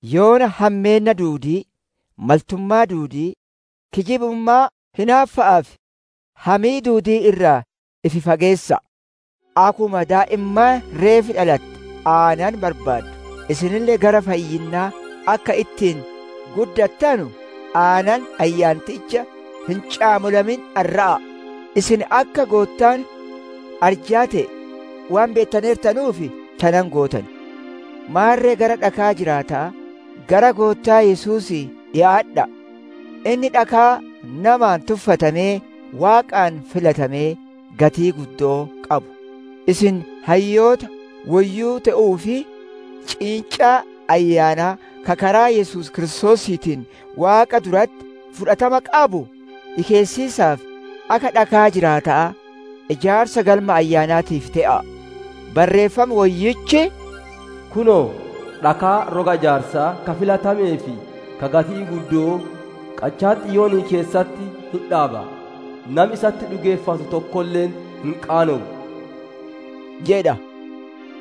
Yoona hammeenna duudii, maltummaa duudii, kijibummaa, hinaaffa'aa fi hamii duudii irraa ifi fageessa'a. Akkuma daa'immaan reef dhalatte aanan barbaaddu, isinille gara fayyinnaa akka ittiin guddattanu aanan Ayyaanticha hin caamolamin dharra'a'a. Isin akka Goottaan arjaa te'e waan beettaneertanuuf tana hin gootan. Maarre gara dhakaa jiraata'aa, gara Goottaa Yesuusii dhikaadha'a; Inni dhakaa namaan tuffatamee Waaqaan filatamee gatii guddoo qabu. Isin hayyoota woyyuu te'uuf, ciincaa ayyaanaa ka karaa Yesuus Kiristoosiitiin Waaqa duratti fudhatama qabu dhikeessiisaaf, akka dhakaa jiraata'aa ijaarsa galma ayyaanaatiif te'a'a. Barreeffam Woyyichi, «Kunoo, dhakaa roga ijaarsaa ka filatamee fi ka gatii guddo'oo qachaa Xiyoonii keessatti hin dhaaba; nami isatti dhugeeffattu tokkolle hin qaanowu» jedha.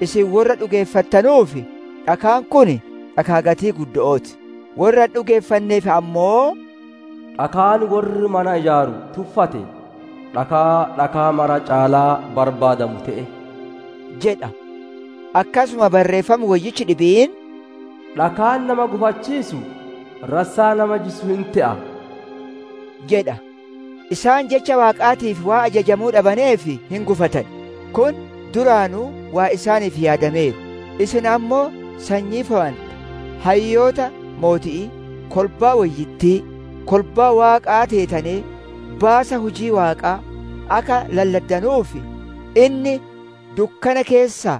Isin worra dhugeeffattanuuf dhakaan kun dhakaa gatii guddo'ooti; worra hin dhugeeffanneef ammoo, «Dhakaan worri mana ijaaru tuffate, dhakaa dhakaa maraa caalaa barbaadamu te'e» jedha. Akkasuma Barreeffami Woyyichi dhibiin, «Dhakaan nama gufachiisu, rassaa nama jissu hin te'a» jedha. Isaan Jecha Waaqaatiif waan ajajamuu dhabaneef hin gufatan. Kun duraanuu waan isaaniif yaadameeru. Isin ammoo sanyii fowante, hayyoota mooti'ii, kolbaa woyyittii, kolbaa Waaqaa teetanee, baasa hujii Waaqaa akka lalladdanuuf, inni dukkana keessaa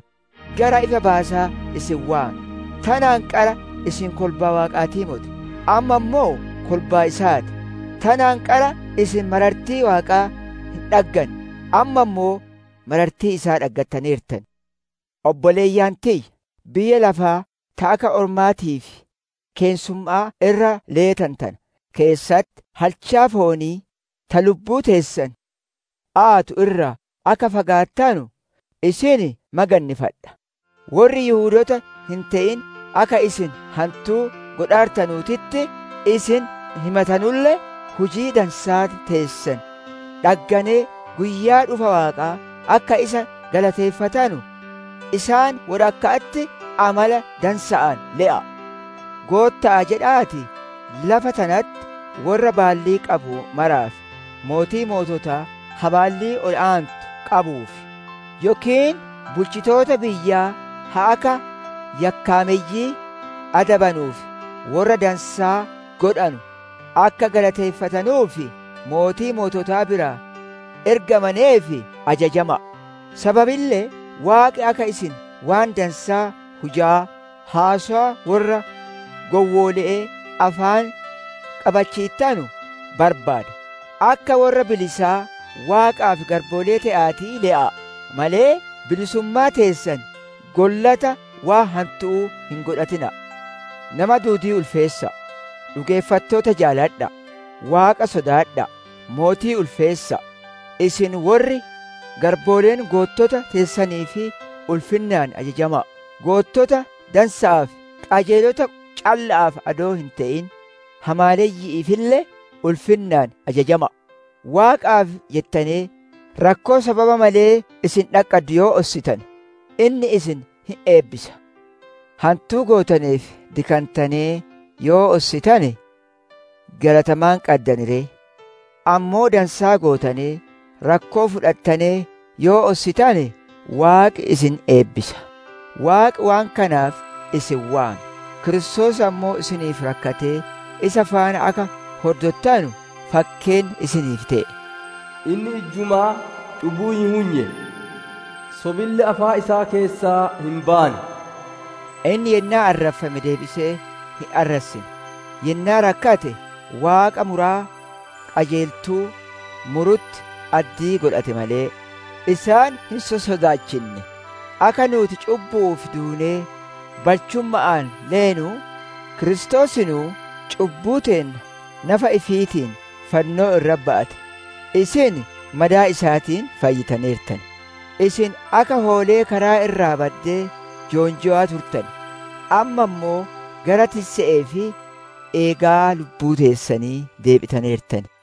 gara ifa baasaa isin waame. Tanaan qara isin kolbaa Waaqaatii moti; amma ammoo kolbaa isaa ti; tanaan qara isin marartii Waaqaa hin dhagganne, amma ammoo marartii isaa dhaggattaneertan. Obboleeyyan tiyya! Biyya lafaa ta akka ormaatii fi keessumma'aa irra leetanu tana keessatti, halchaa foonii ta lubbuu teessan aatu irraa akka fagaattanu isin magannifadha. Worri Yihudoota hin te'in akka isin hantuu godhaartanuutitti isin himatanulle, hujii dansaa teessan dhagganee guyyaa dhufa Waaqaa akka isa galateeffatanu, isaan wodhakka'atti amala dansa'aan le'a'a. Gootta'aaf jedha'aatii lafa tanatti worra baallii qabu maraaf: mootii moototaa ka baallii ol aantuu qabuuf, yookiin bulchitoota biyyaa ka akka yakkaameyyii adabanuu fi worra dansaa godhanu akka galateeffatanuuf, mootii moototaa biraa ergamaneef ajajama'a. Sababille Waaqi akka isin waan dansaa hujaa, haasowa worra gowwoole'ee afaan qabachiittanu barbaada. Akka worra bilisaa, Waaqaaf garboolee te'aatii le'aa malee, bilisummaa teessan gollata waan hantu'uu hin godhatina'a. Nama duudii ulfeessa'a; dhugeeffattoota jaaladha'a; Waaqa sodaadha'a; mootii ulfeessa'a. Isin worri garbooleen goottota teessaniif ulfinnaan ajajama'a; goottota dansa'aa fi qajeelota calla'aaf adoo hin te'in, hamaaleyyi'iifille ulfinnaan ajajama'a. Waaqaaf jettanee, rakkoo sababa malee isin dhaqqaddu yoo ossitane, inni isin hin eebbisa. Hantuu gootaneef dikantanee yoo ossitane, galata maan qaddan ree? Ammoo dansaa gootanee rakkoo fudhattanee yoo ossitane, Waaqi isin hin eebbisa. Waaqi waan kanaaf isin waame; Kiristoos ammoo isiniif rakkatee isa faana akka horddottanu fakkeenna isiniif te'e. Inni ijjumaa cubbuu hin hunye; sobille afaan isaa keessaa hin baane. Inni yennaa arraffame deebisee hin arrassine; yennaa rakkate, Waaqa muraa qajeeltuu murutti addii godhate malee, isaan hin sossodaachinne. Akka nuuti cubbu'uuf duunee balchumma'aan leenu, Kiristoosinuu cubbuu teenna nafa ifiitiin fannoo irratti ba'ate; isin madaa isaatiin fayyitaneertan. Isin akka hoolee karaa irraa baddee joonjaa turtane; amma ammoo gara tisse'ee fi eegaa lubbuu teessanii deebitaneertan.